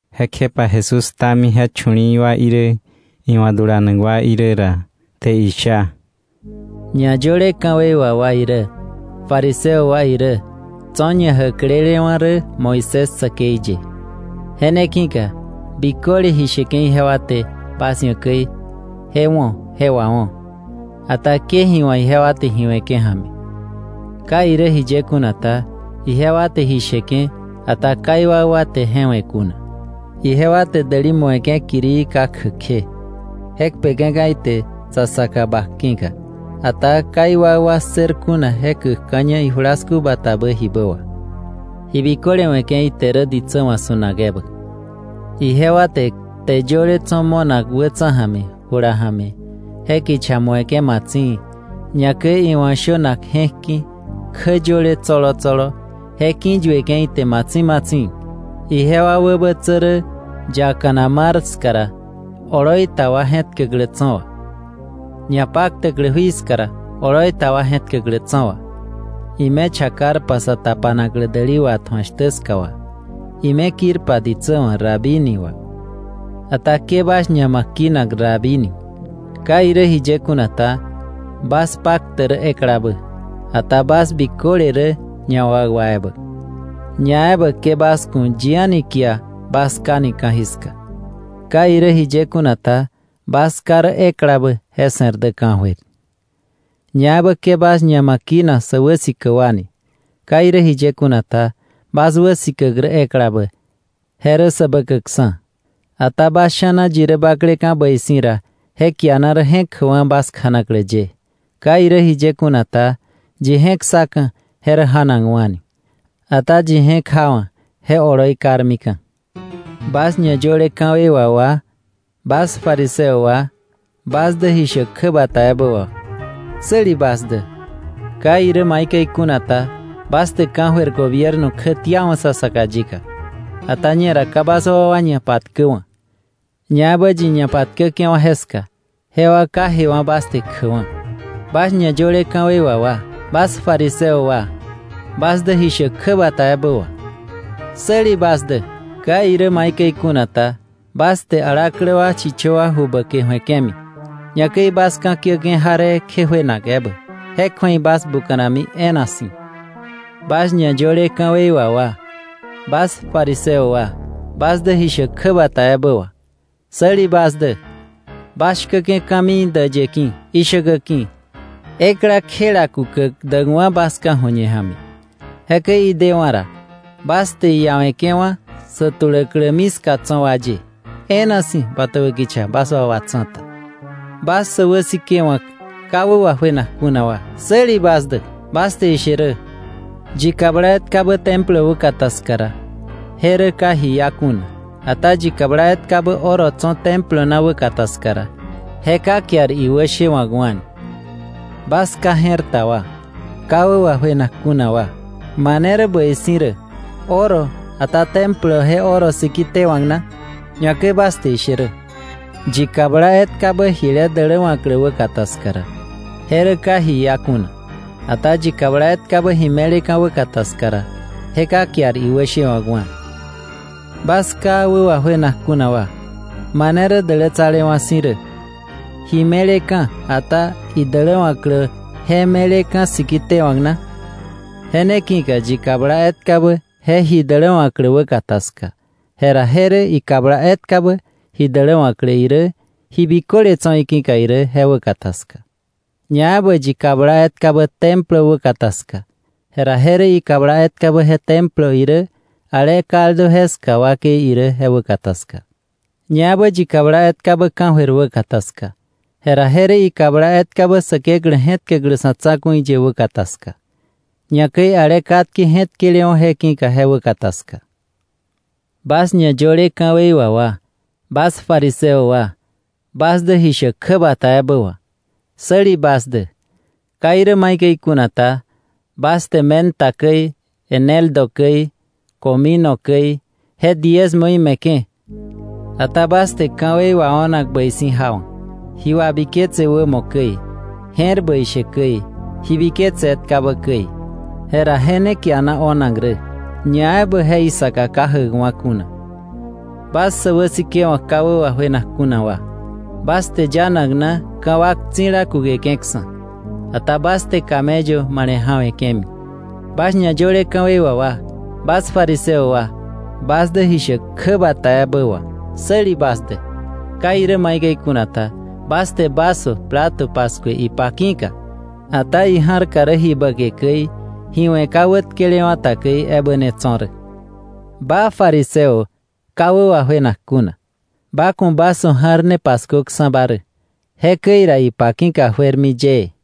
Jekjepa Jesús ktami je chu̱li̱i̱ wa irä, iwa̱ dulanak wa irä ra, te isha: ñayöle ka̱wei wà wa irä fariseo wa irä tso̱ ñajäklelewa̱ rä Moisés säkei ye. Je ne ki̱ka biköle ji sheke̱ ijewa te bas ia̱ käi, je wo̱, je wawo̱. Ata ke ji wa̱k ijewa te ji we̱ke̱ ja̱mi. Ka irä jiye kuna ta, ijewa te ji sheke̱, ata ka iwakwa te je we̱ kuna. Ijewa te däli mu̱eke̱ kirii ka kjäk kje, je kpeke̱ka̱ ite sa saka bak ki̱ka, ata ka iwakwa ssër kuna je käkka̱ña ijulasku batabä jibä wà. Ji biköle we̱ke̱ ite rä ditsä wa̱ su̱nak ebä. Ijewa te kte yöle tso̱ mo̱nak wätsa̱ ja̱mi, jula ja̱mi, je kicha mu̱eke̱ matsi̱i̱, ñakäi iwa̱ shönak je̱k ki̱ kjä yöle tsolo tsolo je ki̱yueke̱ ite matsi̱i̱ matsi̱i̱. Ijewa wäbätsä rä yakana mar ska ra, oloi ta wa je̱tkäklä tso̱ wà, ñapaktäklä jui ska ra, oloi ta wa je̱tkäklä tso̱ wà, ime chakarpa sa tapanaklä däli watju̱ak shtä ska wà, ime kirpa ditsä wa̱ ‘Rabí’ ni wà. “Ata ke bas ñama kinak ‘Rabí ni.’ Ka irä jiye kuna ta, bas paktäk rä eklabä, ata bas biköle rä ñawakwa ebä. Ñaebä ke bas ku̱ yi a̱ni kia bas ká ni ka̱jiska. Ka irä jiye kuna ta, bas Ká rä eklabä, je se̱r dä ka̱jöir. Ñaebä ke bas ñama kinak sä wäsikäk wa ni. Ka irä jiye kuna ta, bas wäsikäk rä eklabä, je rä Säbäkäkksa̱. Ata bas sha̱na yi rä bakleka̱ bäi si̱ ra, je kiana rä je̱k jäkwa̱ bas kjanaklä ye. Ka irä jiye kuna ta, yi je̱k ssaka̱, je rä ja̱nakwa̱ni, ata yi je̱k jawa̱, je oloi karmika̱. “Bas ñayöle ka̱wei wà wa, bas fariseo wa, bas dä ji shäk kjäbata ebä wà, ¡säli bas dä! Ka irä maikäi kuna ta, bas te ka̱jöir gobierno kjätiawa̱ sa saka yika. Ata ñera ka bas wakwa ñapatkäwa̱, ñaebä yi ñapatkäke̱wa̱ jeska, jewa ka jewa̱ bas te kjäkwa̱. “Bas ñayöle ka̱wei wà wa, bas fariseo wa, bas dä ji shäk kjäbata ebä wà, ¡säli bas dä! Ka irä maikäi kuna ta, bas te alaklä wa chichö wa ju bäke ju̱eke̱mi, ñakäi bas ka̱kiäke̱ jaree kje juenak ebä. Je kju̱ei bas buka̱nami e̱e̱na si̱. “Bas ñayöle ka̱wei wà wa, bas fariseo wa, bas dä ji shäk kjäbata ebä wà, ¡säli bas dä! Bas shkäke̱ ka̱mii däyë ki̱, ishäkä ki̱, ekla kjela kukäk däkwa̱ bas ka̱ju̱ñe ja̱mi. Jekäi idewa̱ ra, bas te iiawe̱ke̱wa̱ sä tuläklämi ska tso̱ wa ye, e̱e̱na si̱ bötäbä kicha bas wakwa tsa̱ta. “Bas sä wäsikewa̱k ka wä wajuenak kuna wa, ¡säli bas dä! Bas te ishe rä, yi kabla etkabä Templo wäkata ska ra, je rä ka ji iá kuna; ata yi kabla etkabä oro tso̱ Templo na wäkata ska ra, je ka kiar iwäshewa̱kwa̱. ¡Bas ka je̱r ta wa, ka wä wajuenak kuna wa! ¿Mane rä bäi si̱ rä, oro, ata Templo je oro siki tewa̱k na? Ñakäi bas te ishe rä, yi kabla etkabä jile däläwa̱klä wäkata ska ra, je rä ka ji iá kuna; ata yi kabla etkabä ji me̱leka̱ wäkata ska ra, je ka kiar iwäshewa̱kwa̱. ¡Bas ka wä wajuenak kuna wa! ¿Mane rä dälätsalewa̱ si̱ rä, ji me̱leka̱, ata idäläwa̱klä je me̱leka̱ siki tewa̱k na? Je ne ki̱ka yi kabla etkabä je ji däläwa̱klä wäkata ska, jera je rä ikabla etkabä ji däläwa̱klä irä, ji biköle tso̱ iki̱ka irä je wäkata ska. Ñaebä yi kabla etkabä Templo wäkata ska, jera je rä ikabla etkabä je Templo irä, ale kaldu jeska wakei irä je wäkata ska. Ñaebä yi kabla etkabä ka̱jöir wäkata ska, jera je rä ikabla etkabä Säkeklä je̱tkäklä sa̱ tsa̱ku̱i ye wäkata ska, ñakäi ale katke je̱tkelewa̱ je ki̱ka je wäkata ska. “Bas ñayöle ka̱wei wà wa, bas fariseo wa, bas dä ji shäk kjäbata ebä wà, ¡säli bas dä! Ka irä maikäi kuna ta, bas te menta käi, eneldo käi, comino käi, je diezmoí me̱ke̱. Ata bas te ka̱wei wao̱nak bäi si̱ jawa̱, ji wabiketse wämo käi, je̱r bäi she käi, ji biketse etkabä käi; jera je ne kiana o̱nak rä, ñaebä je isaka ka jäkwa kuna. Bas sä wäsikewa̱k ka wä wajuenak kuna wa, bas te yanak na ka̱wak tsi̱la kukeke̱ksa̱, ata bas te camello male̱ ja̱we̱ke̱mi. “Bas ñayöle ka̱wei wà wa, bas fariseo wa, bas dä ji shäk kjäbata ebä wà, ¡säli bas dä! Ka irä maikäi kuna ta, bas te vaso, plato paskue ipa ki̱ka, ata ija̱rka rä ji bäke käi, ji we̱ ka wätkelewa̱ ta käi ebä ne tso̱ rä. Ba Fariseo ka wä wajuenak kuna, ba ku̱ vaso ja̱r ne paskuöksa̱ba rä, jekäi ra ipa ki̱ka juermi yëë.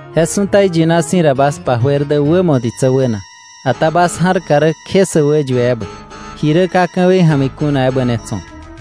Je su̱ta iyina si̱ ra bas pa juer wämo ditsä wäna, ata bas ja̱rka rä kje sä wäyue ebä, ji rä ka ka̱wei ja̱mi kuna ebä ne tso̱.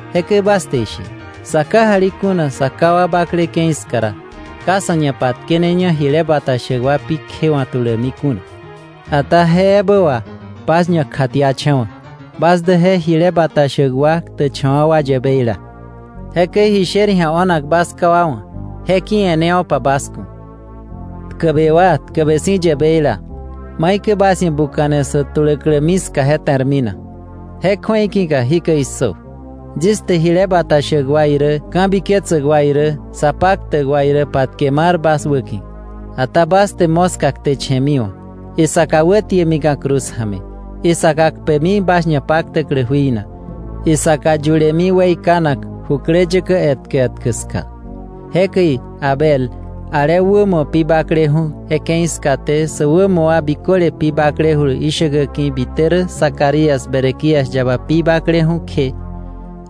Jekäi bas te ishe: ‘Sá kajali kuna sa ká wa bakle ke̱i ska ra, ka sá ñapatkeneña jile bata shäk wa pi kjewa̱k tuläkmi kuna.’ Ata je ebä wà bas ñakjatiacha̱wa̱ bas dä je jile bata shäk wa ktäkcha̱wa̱ wa yäbeila. ¡Jekäi ji sher ji̱a o̱nak bas ká wa wa̱, je ki̱ e̱newo̱pa bas ku̱! “¡Tkäbe wa, tkäbe si̱ yäbeila! ¿Maikäi bas ia̱ buka̱ne sä tuläklämi ska je te̱rmi na? Je kju̱ei ki̱ka ¡jikäi issö! Yis te jile bata shäk wa irä ka̱biketsäk wa irä sa paktäk wa irä patke mar bas wäki̱. Ata bas te moska kteche̱miwa̱, isaka wätiemika̱ cruz ja̱mi, isaka kpemi bas ñapaktäklä jui na, isaka yulemi weikanak jukläyäkä etkä etkä ska. Jekäi Abel, ale wämo pi bakleju̱ je ke̱i skaté sä wämo wa biköle pi baklejulu ishäkä ki̱ bite rä Zacarías Berequías yaba pi bakleju̱ kje,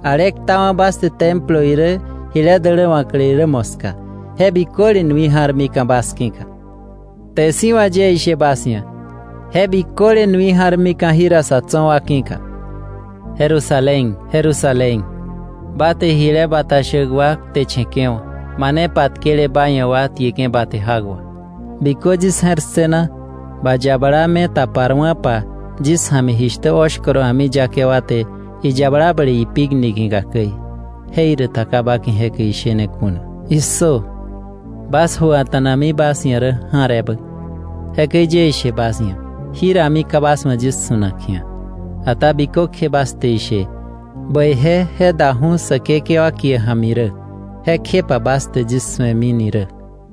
ale ktawa̱ bas te Templo irä jile däläwa̱klä irä moska, je biköle nui ja̱rmika̱ bas ki̱ka. Kte si̱ wà yie ishe bas ia̱, je biköle nui ja̱rmika̱ jira sa̱ tso̱ wa ki̱ka. “Jerusalén, Jerusalén! ¡Ba te jile bata shäk wa kteche̱ke̱wa̱, mane patkele ba ia̱ wa tieke̱ ba te jak wà! ¡Bikö yis je̱r ssëna ba yabala me taparwa̱pa yis ja̱mi jishtä oshkoro a̱miyake wa te iyabala ble ipik niki̱ka käi, jeiräta ka ba ki̱ jekäi ishene kuna! ¡Issö! Bas ju a̱ta̱nami bas ia̱ rä ja̱r ebä. Jekäi yie ishe bas ia̱, jírami ka bas wa̱ yis su̱nak ji̱a, ata bikökje bas te ishe: ‘¡Bäije je daju̱ Säkekewa kie ja̱mi rä!’ kjepa bas te yis su̱emini rä.”